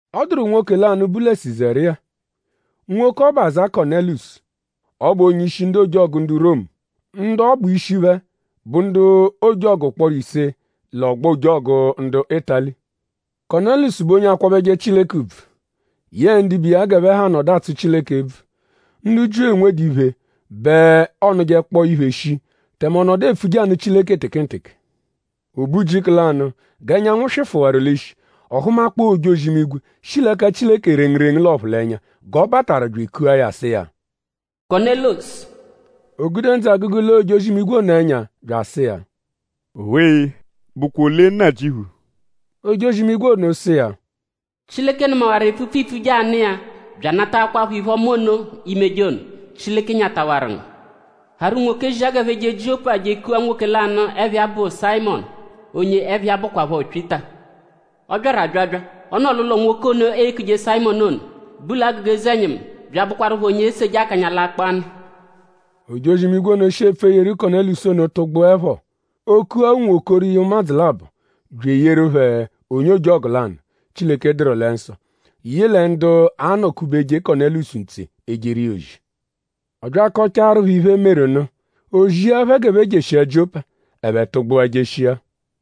Ọ dụru nwoke lanụ, bu lẹ Sizariya. Nwoke ọbu aza Kọnelusu. Ọ bụ onye-ishi ndu ojọgu ndu Romu. Ndu ọ bụ ishi phẹ bụ ndu ojọgu ụkporo ise lẹ “Ọgbo ojọgu ndu Ịtali.” Kọnelusu bụ onye akwabẹje Chileke ùbvù. Yẹ ndibe iya g'ẹphe ha nọdu atsụ Chileke ebvu. Ndu Jiu, enwedu iphe bẹ ọonujekpoo iphe shii; tẹme ọ nọdu epfuje anụ Chileke tekenteke. O be ujiku lanụ; g'ẹnyanwu swịfuwaru l'ishi; ọ hụmakpoo ojozi-imigwe, shi l'ẹka Chileke rengurengu l'ọphulenya g'ọ bataru bya ekua ya sụ iya: “Kọnelusu!” O gude ndzụ-agụgu lee ojozi-imigwe ono ẹnya; bya asụ iya: “Owe-e!?Bụkwa ole Nnajịuphu?” Ojozi-imigwe ono sụ iya: “Chileke nụmawaru epfupfu iipfuje anụ iya bya anataakwaphọ iphe-ọma ono, iimeje ono. Chileke nyatawaru ngu. Harụ unwoke zia g'ẹphe je Jiọpa je ekua nwoke lanụ, ẹpha iya bụ Sayịmonu; onye ẹpha iya bụkwapho Pyịta. Ọ byaru abyabya. Ọ nọ l'ụlo nwoke ono, eekuje Sayịmonu ono, bu l'agụga eze-ẹnyimu bya abụkwarupho onye eseje akanya l'akpọ-anụ.” Ojozi-imigwe ono, shi epfu eyeru Kọnelusu ono tụgbuepho; o kua unwokoro iya ụmadzu labọ bya eyeru phẹ onye ojọgu lanụ; Chileke dụru lẹ nsọ, yị lẹ ndu anọ-kubeje Kọnelusu ntse ejeru iya ozi. Ọ bya akọchaaru phẹ iphe, meru nụ; o zia phẹ g'ẹphe jeshia Jiọpa. Ẹphe tụgbua jeshia.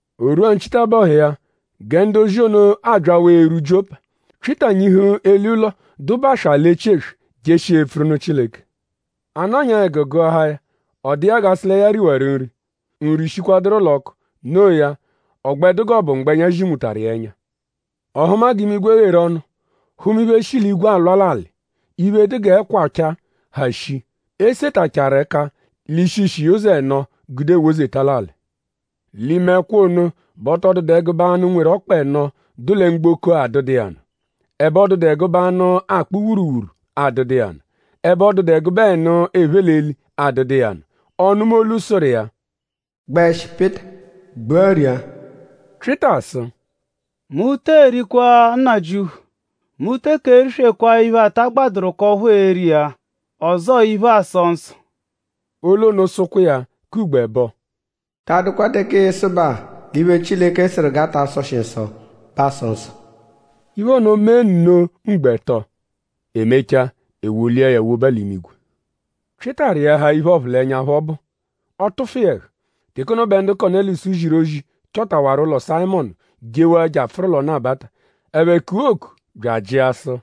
O rwua nchitabọhu iya gẹ ndu-ozi ono abyawaa erwu Jiọpa; Pyịta nyihu eli ụlo, dụ baswaa l'echi eswe; jeshia epfuru nụ Chileke. A nọnyaa ẹgu gụahaa ya. Ọ dụ iya g'a sụ lẹ ya riwaru nri. Nri shikwaduru l'ọku. Noo ya; ọ gbẹ dụ g'ọ bụ mgbẹnya zinwutaru iya ẹnya. Ọ hụma g'imigwe gheru ọnu; hụma iphe, shi l'igwe alwa l'alị; iphe, dụ g'ẹkwa ọchaa, ha shii, e setachaaru ẹka l'ishi-ishi iya ụzo ẹno gude ewozeta l'alị. L'ime ẹkwa ono bẹ ọ tọ dụdu ẹgube anụ, nweru ọkpa ẹno, dụ lẹ mgboko-a adụdu iya nụ. Ẹbe ọ dụdu ẹgube anụ, akpụ wuruwuru adụdu iya nụ. Ẹbe ọ dụdu ẹgube ẹnu, ephe l'eli adụdu iya nụ. Ọ nụma olu, sụru iya: “Gbẹshi Pyịta! Gbua ria!” Pyịta sụ: “Mu tee rikwa Nnajịuphu! Mu teke eriswekwaa iphe, ta agbadụru k'ọphu ee-ri iya; ọzoo iphe, aasọ nsọ.” Olu ono sụkwa iya k'ugbo ẹbo: “Ta adụkwa teke ịisubaa l'iphe, Chileke sụru g'a ta sọshi nsọ bẹ aasọ nsọ.” Iphe ono mee nno ugbo ẹto. E mechaa; e wolia ya woba l'imigwe. Pyịta rịahaa iphe, ọphulenya phọ bụ; ọ tụfu iya ẹhu. Teke ono bẹ ndu Kọnelusu ziru ozi chọtawaru ụlo Sayịmonu jewaa je apfụru l'ọnu-abata. Ẹphe kua oku bya ajịa sụ: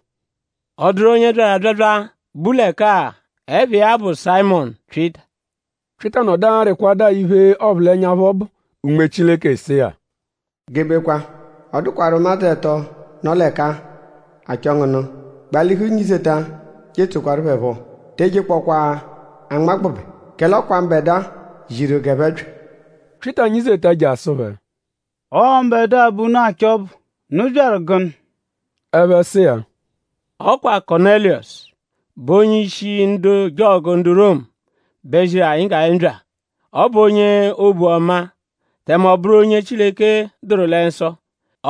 “?Ọ dụru onye byaru abyabya, bu l'ẹka-a, ẹpha iya bụ Sayịmonu Pyịta?” Pyịta nọdu arịkwadua iphe, ọphulenya phọ bụ. Unme Chileke sụ iya: “Gebekwa! Ọ dụkwaru ụmadzu ẹto, nọ l'ẹka-a, achọ ngu nụ. Gbalihu nyizeta je etsoẹkwaru phẹ phọ; te ejekpọkwaa anmagbụbe; kẹle ọ kwa mbẹdua ziru g'ẹphe bya.” Pyịta nyizeta je asụ phẹ: “Ọo mbẹdua bẹ unu achọ ọbu.?Unu byaru gụnu?” Ẹphe sụ iya: “Ọ kwa Kọnelusu, bụ onye-ishi ndu ojọgu ndu Romu bẹ ziru anyi g'anyi bya. Ọ bụ onye obu ọma; tẹme ọ bụru onye Chileke dụru lẹ nsọ.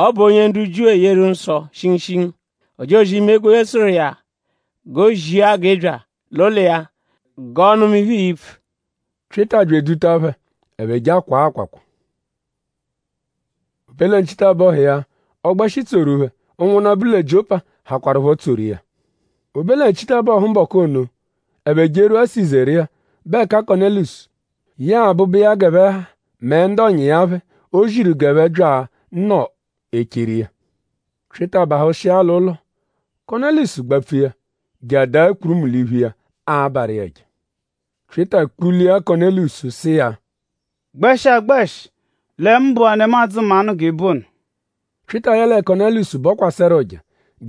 Ọ bụ onye ndu Jiu eyeru nsọ shingushingu. Ojozi-imigwe sụru iya g'o zia g'ị bya l'ụlo iya g'ọo-nụma iphe, ii-pfu.” Pyịta bya eduta phẹ; ẹphe je akwaa akwakwa. O be lẹ nchitabọhu iya; ọ gbẹshi tsoru phẹ. Ụnwunna, bu lẹ Jiọpa hakwarụpho tsoru iya. O be lẹ nchitabọhu mbọku ono; ẹphe jerwua Sizariya, bụ ẹka Kọnelusu yẹe abụbu iya g'ẹphe ha mẹ ndu ọ̀nyà iya phẹ, o ziru g'ẹphe bya nọ echeru iya. Pyịta bahụshia l'ụlo; Kọnelusu gbapfu iya je adaa kpurumu l'iphu iya abarụ iya ẹja. Pyịta kpụlia Kọnelusu sụ iya: “Gbẹshi agbẹshi lẹ mu bụ-a nemadzụ mmanụ g'ị bụ ono.” Pyịta yẹle Kọnelusu bọkwaseru ụja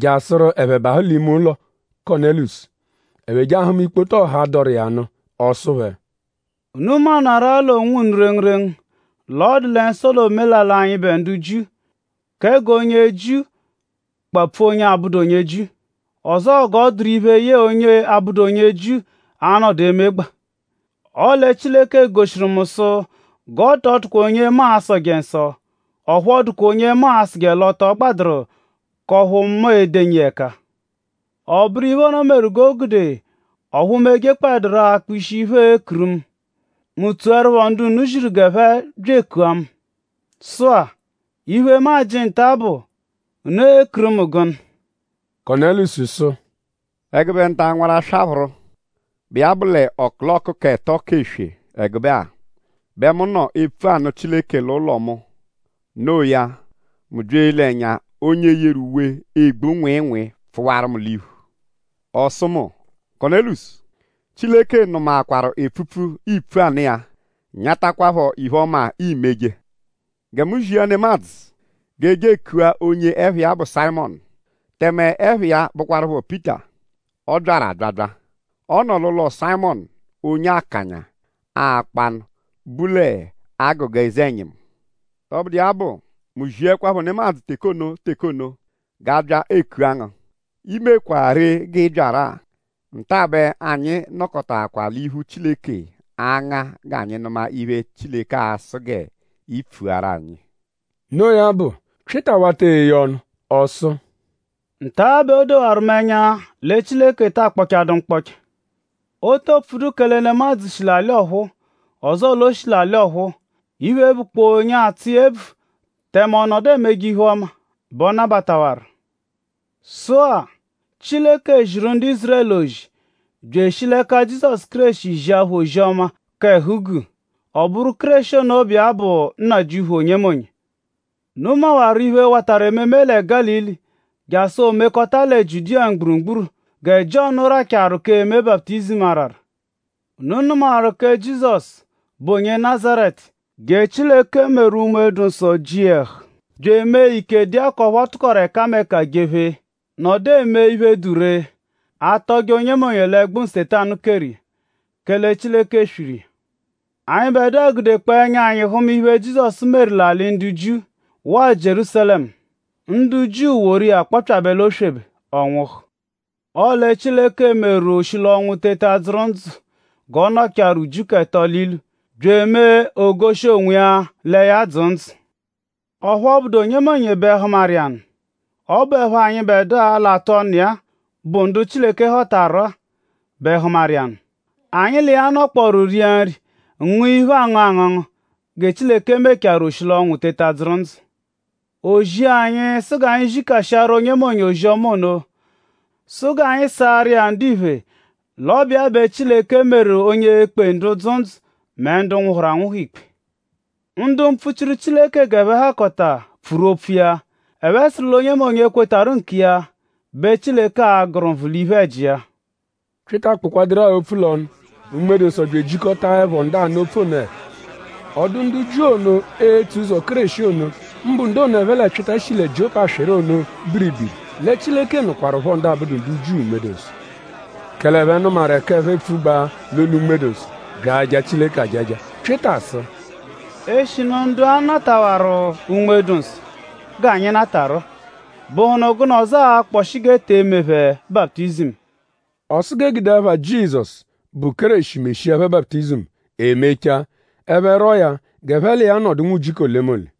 jasụru ẹphe bahụ l'ime ụlo Kọnelusu. Ẹphe je ahụma ikpoto ọha, dọru iya nụ. Ọ sụ phẹ: “Unu maanarụ-a l'onwunu rengurengu l'ọ dụ lẹ nsọ l'omelalị anyịbe ndu Jiu kẹ g'onye Jiu kpapfu onye abụdu onye Jiu; ọzoo g'ọ dụru iphe, yẹe onye abụdu onye Jiu anọdu emegbaa. Ọle Chileke goshiru mu sụ g'ọ tọ dụkwa onye mu a-sọje nsọ; ọphu ọ dụkwa onye mu a-sụje l'ọ tọ gbadụru k'ọphu mu e-denyi iya ẹka. Ọ bụru iphe ono meru g'o gude ọphu mu ejekpọdaru rọ akpa ishi iphe, eekuru mu. Mu tsoẹrupho ndu unu ziru g'ẹphe bya ekua mu. Sụ-a; iphe, mu ajị nta-a bụ:?unu ekuru mu gụnu?” Kọnelusu sụ: “Ẹgube nta-a nwaraswaphụru, bụ iya bụ l'ọkuloku k'ẹto k'eswe ẹgube-a bẹ mu nọ epfu anụ Chileke l'ụlo mu. No iya; mu bya ele ẹnya; onye yeru uwe, egbu nwịinwii pfụwaru mu l'iphu. Ọ sụ mu: Kọnelusu! ‘Chileke nụmaakwaru epfupfu, iipfu anụ iya; nyatakwaaphọ iphe-ọma, iimeje. Gẹ mu zia nemadzụ g'e je ekua onye ẹpha iya bụ Sayịmonu; tẹme ẹpha iya bụkwarupho Pyịta. Ọ byaru abyabya. Ọ nọ l'ụlo Sayịmonu onye akanya akpọ-anụ, bu l'agụga eze-ẹnyimu.’ Tọbudu iya bụ; mu ziẹkwapho nemadzụ teke ono teke ono g'a bya ekua ngu. I mekwaa ree g'ị byaru-a. Nta bẹ anyi nọkotaakwaa l'iphu Chileke anga g'anyi nụma iphe, Chileke a-sụ ngu g'i pfuaru anyi.” Noo ya bụ; Pyịta wata eye ọnu. Ọ sụ: “Nta bẹ o dowarụ mu ẹnya lẹ Chileke ta akpọchadu mkpọcha. O to pfudu kẹle nemadzụ shi l'alị ọphuu; ọzoo l'o shi l'alị ọphuu. Iphe, bụkpoo onye atsụ iya ebvu; tẹme ọ nọdu emeje iphe-ọma bẹ ọ nabatawaru. Sụ-a; Chileke ziru ndu Ízurẹlu ozi bya eshi l'ẹka Jizọsu Kéreshi zia phẹ ozi-ọma k'ẹhu-guu. Ọ bụru Kéreshi ono, bụ iya bụ Nnajịuphu onyemonye. Unu mawaru iphe, watarụ ememe lẹ Gálili jasụ o mekọta lẹ Jiudiya mgburugburu gẹ Jiọnu rachaaru k'eme baputizimu arara. Unu nụmawaru kẹ Jizọsu, bụ onye Nazaretu; gẹ Chileke meru Unme-dụ-Nsọ ji iya ẹhu bya emee ike dụ iya k'ọphu ọ tụkoru ẹkameka jephee nọdu eme iphe, dụ ree; atọje onyemonye l'ẹgbu, Nsetanu keru iya; kẹle Chileke swiru iya. Anyịbedua gudekpọo ẹnya anyi hụma iphe, Jizọsu meru l'alị ndu Jiu waa Jierúsalẹmu. Ndu Jiu woru iya kpọpyabe l'oswebe; ọ nwụhu. Ọle Chileke meru o shi l'ọnwu teta dzụru ndzụ g'ọ nọchaaru ujiku ẹto l'ilu; bya emee o goshi onwiya lẹ ya dzụ ndzụ. Ọphu ọ bụdu onyemonye bẹ hụmaru iya nụ. Ọ bụepho anyịbedua, l'atụ ọnu iya-a, bụ ndu Chileke họtaru-a bẹ hụmaru iya nụ. Anyi l'iya nọkporu ria nri ngụa iphe, aangụ angụngu gẹ Chileke mechaarụ o shi l'ọnwu teta dzụru ndzụ. O zia anyi sụ g'anyi zikashiaru onyemonye ozi-ọma ono. Sụ g'anyi saarụ iya ndiphe l'ọ bụ iya bẹ Chileke meru onye e-kpe ndu dzụ ndzụ mẹ ndu nwụhuru anwụhu ikpe. Ndu mpfuchiru Chileke g'ẹphe hakọta pfuru opfu iya. Ẹphe sụru l'onyemonye, kwetarụ nkiya bẹ Chileke a-gụru nvụ l'iphe-ẹji iya.” Pyịta kpụkwaduru-a opfu l'ọnu; Unme-dụ-Nsọ bya ejikọtaepho ndu anụ opfu ono ẹhu. Ọ dụ ndu Jiu ono, etso ụzo Kéreshi ono; mbụ ndu ono, ẹphe lẹ Pyịta shi lẹ Jiọpa swịru ono biribiri lẹ Chileke nụkwarupho ndu abụdu ndu Jiu Unme-dụ-Nsọ. Kẹle ẹphe nụmaru ẹka ẹphe epfugbaa l'olu Unme-dụ-Nsọ; bya aja Chileke ajaja. Pyịta sụ: “Eshinu ndu-a natawaru Unme-dụ-Nsọ g'anyi natarụ-a;?bụhunu gụnu ọzo akpọshi g'e te eme phẹ baputizimu?” Ọ sụ g'e gude ẹpha Jizọsu, bụ Kéreshi meshia phẹ baputizimu. E mechaa; ẹphe rwọo ya g'ẹphe l'iya nọdu nwujiku olemole.